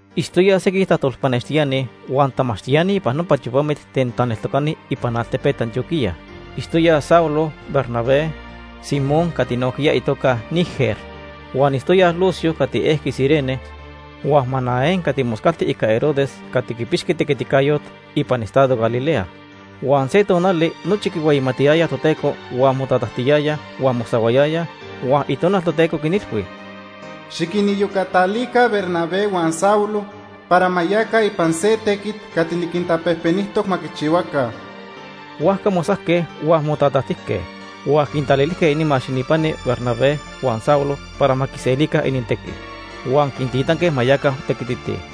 Itztoyaj sequij tajtolpanextiani huan tamachtiani ipan nopa tiopamit ten taneltocani ipan altepet Antioquía. Itztoyaj Saulo, Bernabé, Simón cati nojquiya itoca Niger. Huan itztoyaj Lucio cati ejqui Cirene huan Manaén cati moscalti ica Herodes cati quipixqui tequiticayot ipan estado Galilea. Huan se tonali nochi quihueyimatiyayaj Toteco huan motatajtiyayaj huan mosahuayayaj, huan Itonal Toteco quinilhui: “Xiquiniyocatalica Bernabé huan Saulo para ma yaca ipan se tequit cati niquintapejpenijtoc ma quichihuaca.” Huajca mosajque huan motatajtijque, huan quintalilijque inimax ininpani Bernabé huan Saulo para ma quiselica inintequi. Huan quintitanque ma yaca tequititij.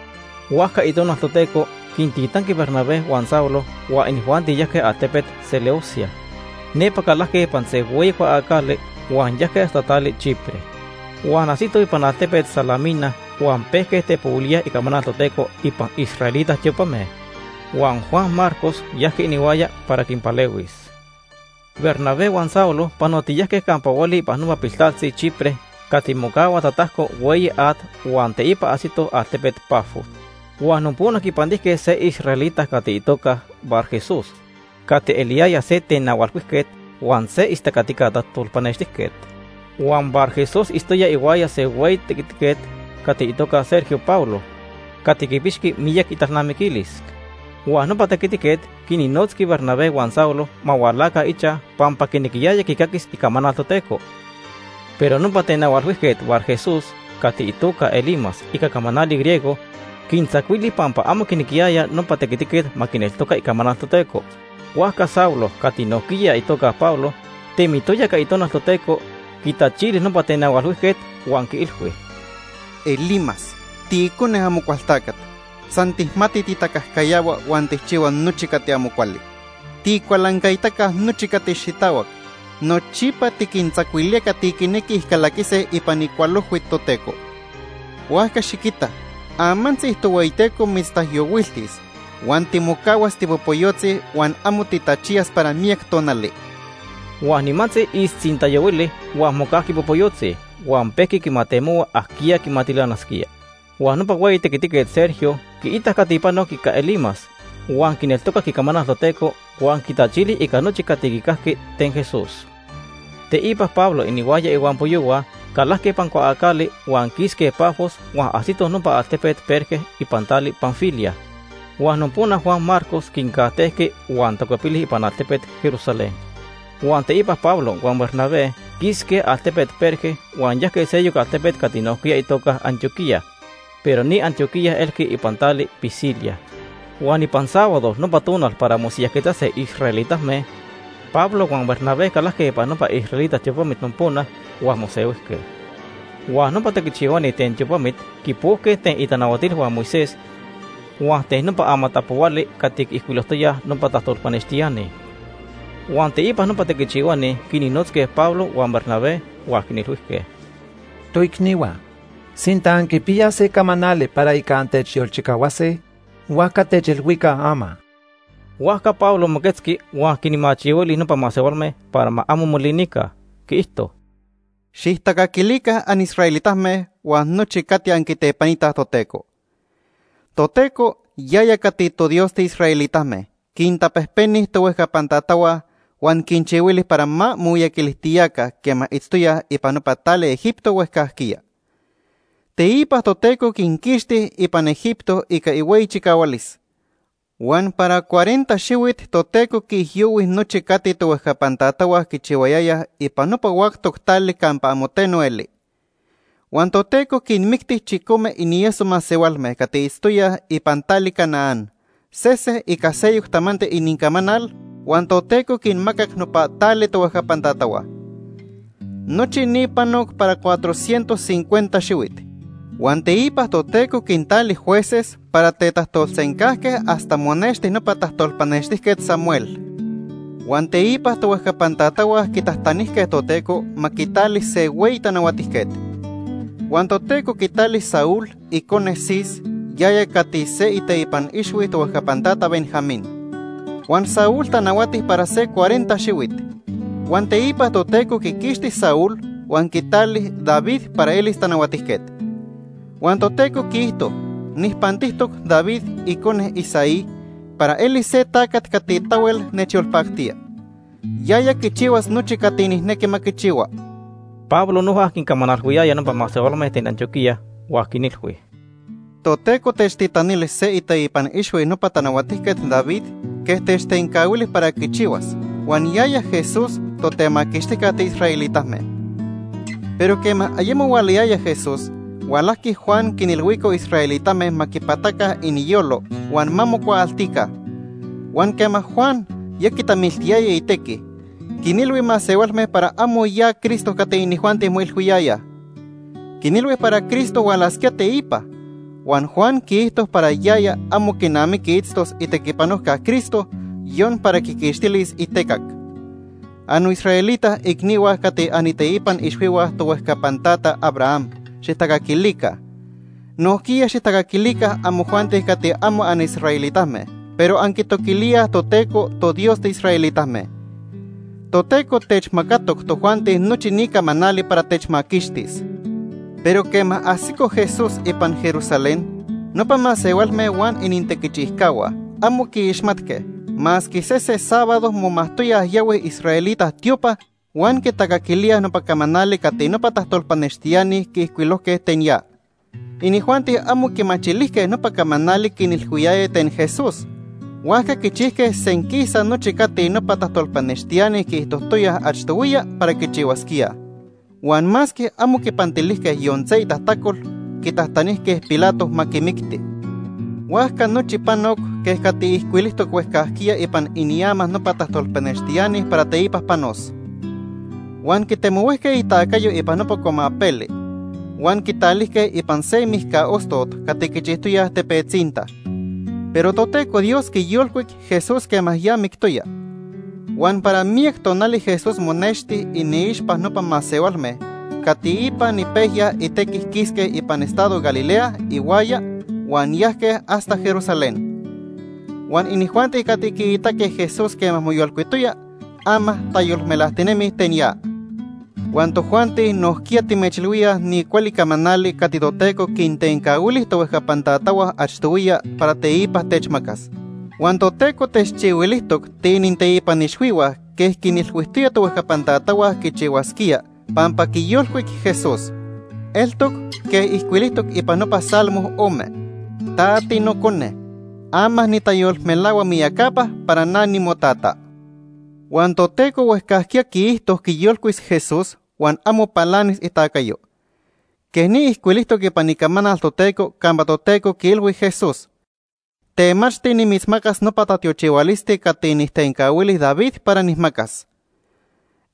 Huajca Itonal Toteco quintitanqui Bernabé huan Saulo huan inijuanti yajque altepet Seleucia. Nepa calajque ipan se hueyi cuaacali huan yajque hasta tali Chipre. Huan ajsitoj ipan altepet Salamina huan pejque tepohuilíaj icamanal Toteco ipan israelita tiopame. Huan Juan Marcos yajqui inihuaya para quinpalehuis. Bernabé huan Saulo panotiyajque campa hueli ipan nopa piltaltzi Chipre cati mocahua tatajco hueyi at huan teipa ajsitoj altepet Pafos. Huan nopona quipantijque se israelita cati itoca Barjesús cati eliyaya se tenahualhuijquet huan se istacatica tajtolpanextijquet. Huan Barjesús itztoya ihuaya se hueyi tequitiquet cati itoca Sergio Paulo, cati quipixqui miyac italnamiquilis. Huan nopa tequitiquet quinnotzqui Bernabé huan Saulo ma hualaca ichaj pampa quinequiyaya quicaquis icamanal Toteco. Pero nopa tenahualhuijquet Barjesús, cati itoca Elimas ica camanali griego, quintzacuili pampa amo quinequiyaya nopa tequitiquet ma quineltoca icamanal Toteco. Huajca Saulo, cati nojquiya itoca Pablo, temitoya ica Itonal Toteco, quitachili nopa tenahualhuijquet, huan quiilhui: ―Elimas, tiicone Amocualtacat. San tijmati titacajcayahua huan tijchihua nochi cati amo cuali. Tiicualancaitaca nochi cati xitahuac. Nochipa tiquintzacuilía cati quinequij calaquise ipan icualojhui Toteco. Huajca xiquita, amantzi Tohueyiteco mitztaijyohuiltis huan timocahuas tipopoyotzi huan amo titachiyas para miyac tonali. Huan nimantzi ixtzintayohuili huan mocajqui popoyotzi huan pejqui quimatemohua ajquiya quimatilanasquía. Huan nopa hueyi tequitiquet Sergio quiitac cati panoc ica Elimas, huan quineltocac icamanal Toteco huan quitachili ica nochi cati quicajqui ten Jesús. Teipa Pablo inihuaya ihuampoyohua calajque ipan cuaacali huan quisque Pafos huan ajsitoj nopa altepet Perge ipan tali Panfilia. Huan nopona Juan Marcos quincajtejqui huan tacuepili ipan altepet Jerusalén. Huan teipa Pablo huan Bernabé quisque altepet Perge huan yajque seyoc altepet cati nojquiya itoca Antioquía pero ni Antioquía elqui ipan tali Pisidia. Huan ipan sábado, nopa tonal para mosiyajquetzase israelitame, Pablo huan Bernabé calajque ipan nopa israelita tiopamit nopona huan mosehuijque. Huan nopa tequichihuani ten tiopamit quipojque ten itanahuatilhua Moisés huan ten nopa amatapohuali cati quiijcuilojtoyaj nopa tajtolpanextiani. Huan teipa nopa tequichihuani quinnotzque Pablo huan Bernabé huan quinilhuijque: ―Toicnihua, sinta anquipiyaj se camanali para ica antechyolchicahuase, huajca techilhuica ama. Huajca Pablo moquetzqui huan quinmachihuili nopa masehualme para ma amo molinica. Quiijto: ―Xijtacaquilica anisraelitame huan nochi cati anquitepanitaj Toteco. Toteco, yaya cati toDios tiisraelitame, quintapejpeni tohuejcapan tatahua, huan quinchihuili para ma momiyaquilijtiyaca quema itztoyaj ipan nopa tali Egipto huejcajquiya. Teipa Toteco quinquixti ipan Egipto ica ihueyi chicahualis. Huan para cuarenta xihuit Toteco quiijyohui nochi cati tohuejcapan tatahua quichihuayayaj ipan nopa huactoc tali campa amo teno eli. Huan Toteco quinmicti chicome inieso masehualme cati itztoyaj ipan tali Canaán, sese ica seyoc tamanti inincamanal huan Toteco quinmacac nopa tali tohuejcapan tatahua. Nochi ni panoc para cuatrocientos cincuenta xihuit. “Huan teipa Toteco quintali jueces para tetajtolsencajque hasta monexti nopa tajtolpanextijquet Samuel. Huan teipa tohuejcapan tatahua quitajtanijque Toteco ma quitali se hueyi tanahuatijquet. Huan Toteco quitali Saúl, icone Cis, yaya cati se iteipan ixhui tohuejcapan tata Benjamín. Huan Saúl tanahuati para se cuarenta xihuit. Huan teipa Toteco quiquixti Saúl huan quitali David para elis tanahuatijquet. Huan Toteco quiijto: ‘Nijpantijtoc David, icone Isaí, para eli se tacat cati tahuel nechyolpactía. Yaya quichihuas nochi cati nijnequi ma quichihua.’” Pablo noja quincamanalhuiyaya nopa masehualme ten Antioquía huan quinilhui: ―Toteco techtitanili se iteipan ixhui nopa Tanahuatijquet David quej techtencahuili para quichihuas, huan yaya Jesús, Totemaquixtijca tiisraelitame. Pero quema ayemo hualayaya Jesús, hualajqui Juan quinilhuico israelitame ma quipataca iniyolo huan ma mocuaaltica. Huan quema Juan ya quitamiltiyaya itequi, quinilhui masehualme para amo ya Cristo cati inijuanti moilhuiyayaj. Quinilhui para Cristo hualasquía teipa. Huan Juan quiijto para yaya amo quinamiqui itztos itequipanojca Cristo, yon para quiquixtilis itecac. “Annoisraelita icnihua cati aniteipan ixhuihua tohuejcapan tata Abraham, xijtacaquilica. Nojquiya xijtacaquilica amojuanti cati amo anisraelitame pero anquitoquilíaj Toteco, toDios tiisraelitame. Toteco techmacatoc tojuanti nochi ni camanali para techmaquixtis. Pero quema ajsico Jesús ipan Jerusalén, nopa masehualme huan inintequichijcahua, amo quiixmatque, masque sese sábado momajtoyaj yahuij israelita tiopa huan quitacaquilíaj nopa camanali cati nopa tajtolpanextiani quiijcuilojque ten ya. Inijuanti amo quimachilijque nopa camanali quinilhuiyaya ten Jesús. Huajca quichijque senquisa nochi cati nopa tajtolpanextiani quiijtojtoyaj achtohuiya para quichihuasquíaj. Huan masque amo quipantilijque yon se itajtacol, quitajtanijque Pilato ma quimicti. Huajca nochi panoc quej cati ijcuilijtoc huejcajquiya ipan iniama nopa tajtolpanextiani para teipa panos. Huan quitemohuijque itacayo ipan nopa cuamapeli, huan quitalijque ipan se mijca ostot cati quichijtoyaj tepetzinta. Pero Toteco Dios quiyolcuic Jesús quema ya mictoya, huan para miyac tonali Jesús monexti iniixpa nopa masehualme cati ipan ipejya itequi quisque ipan estado Galilea ihuaya huan yajque hasta Jerusalén. Huan inijuanti cati quiitaque Jesús quema moyolcuitoya, ama tayolmelajtinemij ten ya. “Huan tojuanti nojquiya timechilhuíaj ni cuali camanali cati Toteco quintencahuili tohuejcapan tatahua achtohuiya para teipa techmacas. Huan Toteco techchihuilijtoc tiininteipan ixhuihua quej quinilhuijtoya tohuejcapan tatahua quichihuasquía pampa quiyolcuic Jesús. Eltoc quej ijcuilijtoc ipan nopa Salmo ome: ‘Ta tiNocone. Ama nitayolmelahua miyacapa para na nimoTata.’ Huan Toteco huejcajquiya quiijto quiyolcuis Jesús huan amo palanis itacayo. Quej ni ijcuilijtoc ipan Icamanal Toteco campa Toteco quiilhui Jesús: ‘Temachti nimitzmacas nopa tatiochihualisti cati nijtencahuili David para nijmacas.’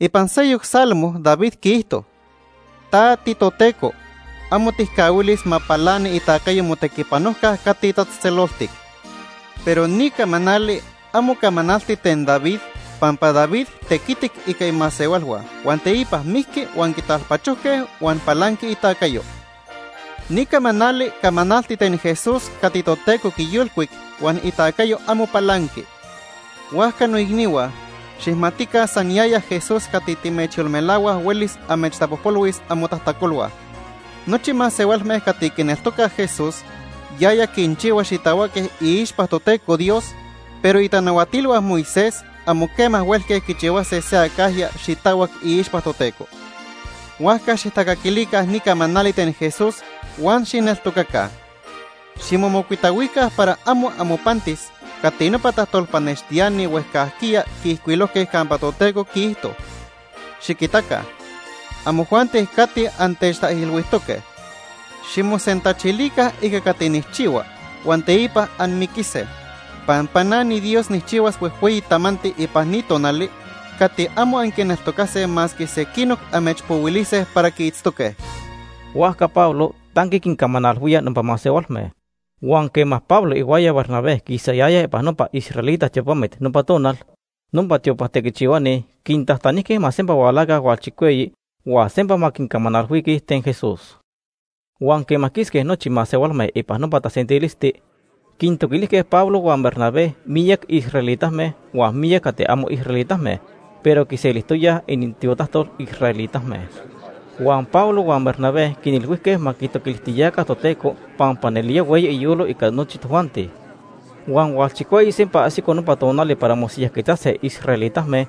Ipan seyoc Salmo David quiijto: ‘Ta tiToteco, amo tijcahuilis ma palani itacayo Motequipanojca Cati Tatzejtzeloltic.’ “Pero ni camanali amo camanalti ten David pampa David tequitic ica imasehualhua huan teipa mijqui huan quitalpachojque huan palanqui itacayo. Ni camanali camanalti ten Jesús cati Toteco quiyolcuic huan itacayo amo palanqui. Huajca noicnihua, xijmatica san yaya Jesús cati timechyolmelahuaj huelis amechtapojpolhuis amotajtacolhua. Nochi masehualme cati quineltocaj Jesús, yaya quinchihua xitahuaque iixpa Toteco Dios, pero itanahuatilhua Moisés amo quema huelque quichihuase se acajya xitahuac iixpa Toteco. Huajca xijtacaquilica ni camanali ten Jesús huan xijneltocaca. Ximomocuitahuica para amo amopantis cati nopa tajtolpanextiani huejcajquiya quiijcuilojque campa Toteco quiijto: ‘Xiquitaca, amojuanti cati antechtaijilhuijtoque. Ximosentachilica ica cati nijchihua huan teipa anmiquise, Pampa na niDios nijchihuas huejhueyi tamanti ipan ni tonali cati amo anquineltocase masque sequinoc amechpohuilise para quiitztoque.’” Huajca Pablo tanqui quincamanalhuía nopa masehualme. Huan quema Pablo ihuaya Bernabé quisayayaj ipan nopa israelita tiopamit nopa tonal, nopa tiopa tequichihuani quintajtanijque ma sempa hualaca hualchicueyi huan sempa ma quincamanalhuise ten Jesús. Huan quema quisque nochi masehualme ipan nopa tasentilisti, quintoquilijque Pablo huan Bernabé miyac israelitame huan miyac cati amo israelitame pero quiselijtoyaj inintiotajtol israelitame. Huan Pablo huan Bernabé quinilhuijque ma quitoquilijtiyaca Toteco pampa nelía hueyi iyolo ica nochi tojuanti. Huan hualchicueyi sempa ajsico nopa tonali para mosiyajquetzase israelitame,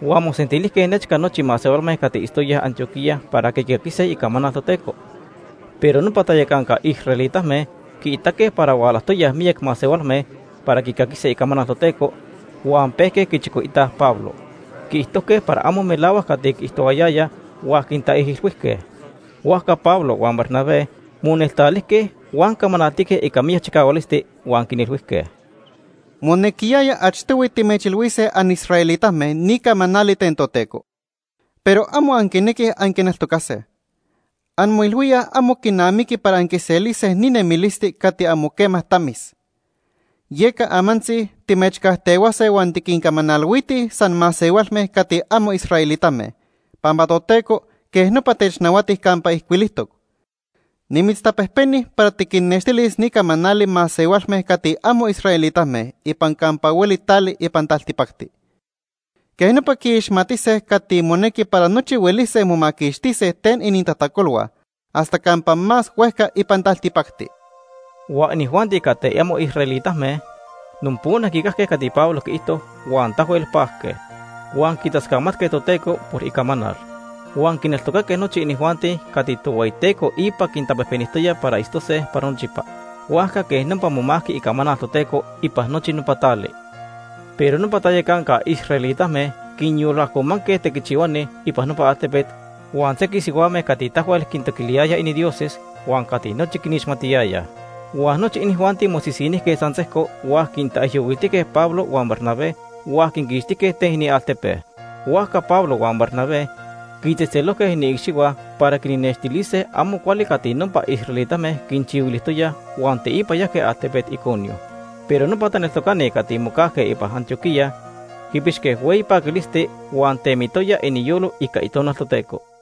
huan mosentilijque nechca nochi masehualme cati itztoyaj Antioquía para quicaquise icamanal Toteco. Pero nopa tayacanca israelitame quiitaque para hualajtoyaj miyac masehualme para quicaquise icamanal Toteco huan pejque quichicoitaj Pablo. Quiijtojque para amo melahuac cati quiijtohuayayaj huan quintaijilhuijque. Huajca Pablo huan Bernabé moneltalijque huan camanaltique ica miyac chicahualisti huan quinilhuijque: ―Monequiyaya achtohui timechilhuise anisraelitame ni camanali ten Toteco. Pero amo anquinequij anquineltocase. Anmoilhuíaj amo quinamiqui para anquiselise ni nemilisti cati amo quema tamis. Yeca amantzi timechcajtehuase huan tiquincamanalhuitij san masehualme cati amo israelitame, pampa Toteco quej nopa technahuati campa ijcuilijtoc: ‘Nimitztapejpeni para tiquinnextilis ni camanali masehualme cati amo israelitame ipan campa hueli tali ipan taltipacti. Quej nopa quiixmatise cati monequi para nochi huelise momaquixtise ten inintajtacolhua hasta campa más huejca ipan taltipacti.’ Huan inijuanti cati amo israelitame nopona quicajque cati Pablo quiijto huan tahuel pajque. Huan quitascamatque Toteco por icamanal. Huan quineltocaque nochi inijuanti cati Tohueyiteco ipa quintapejpenijtoya para itztose para nochipa. Huajca quej nopa momajqui icamanal Toteco ipan nochi nopa tali. Pero nopa tayacanca israelitame quinyolajcomanque tequichihuani ipan nopa altepet huan sequij sihuame cati tahuel quitoquilijque inindioses huan cati nochi quinixmatiyayaj. Huan nochi inijuanti mosisinijque san sejco huan quintaijyohuiltíaj Pablo huan Bernabé huan quinquixtijque ten inialtepe. Huajca Pablo huan Bernabé quitzejtzelojque iniicxihua para quinnextilise amo cuali cati nopa israelitame quinchihuilijtoyaj huan teipa yajque altepet Iconio. Pero nopa taneltocani cati mocajque ipan Antioquía quipixque hueyi paquilisti huan temitoya iniyolo ica Itonal Toteco.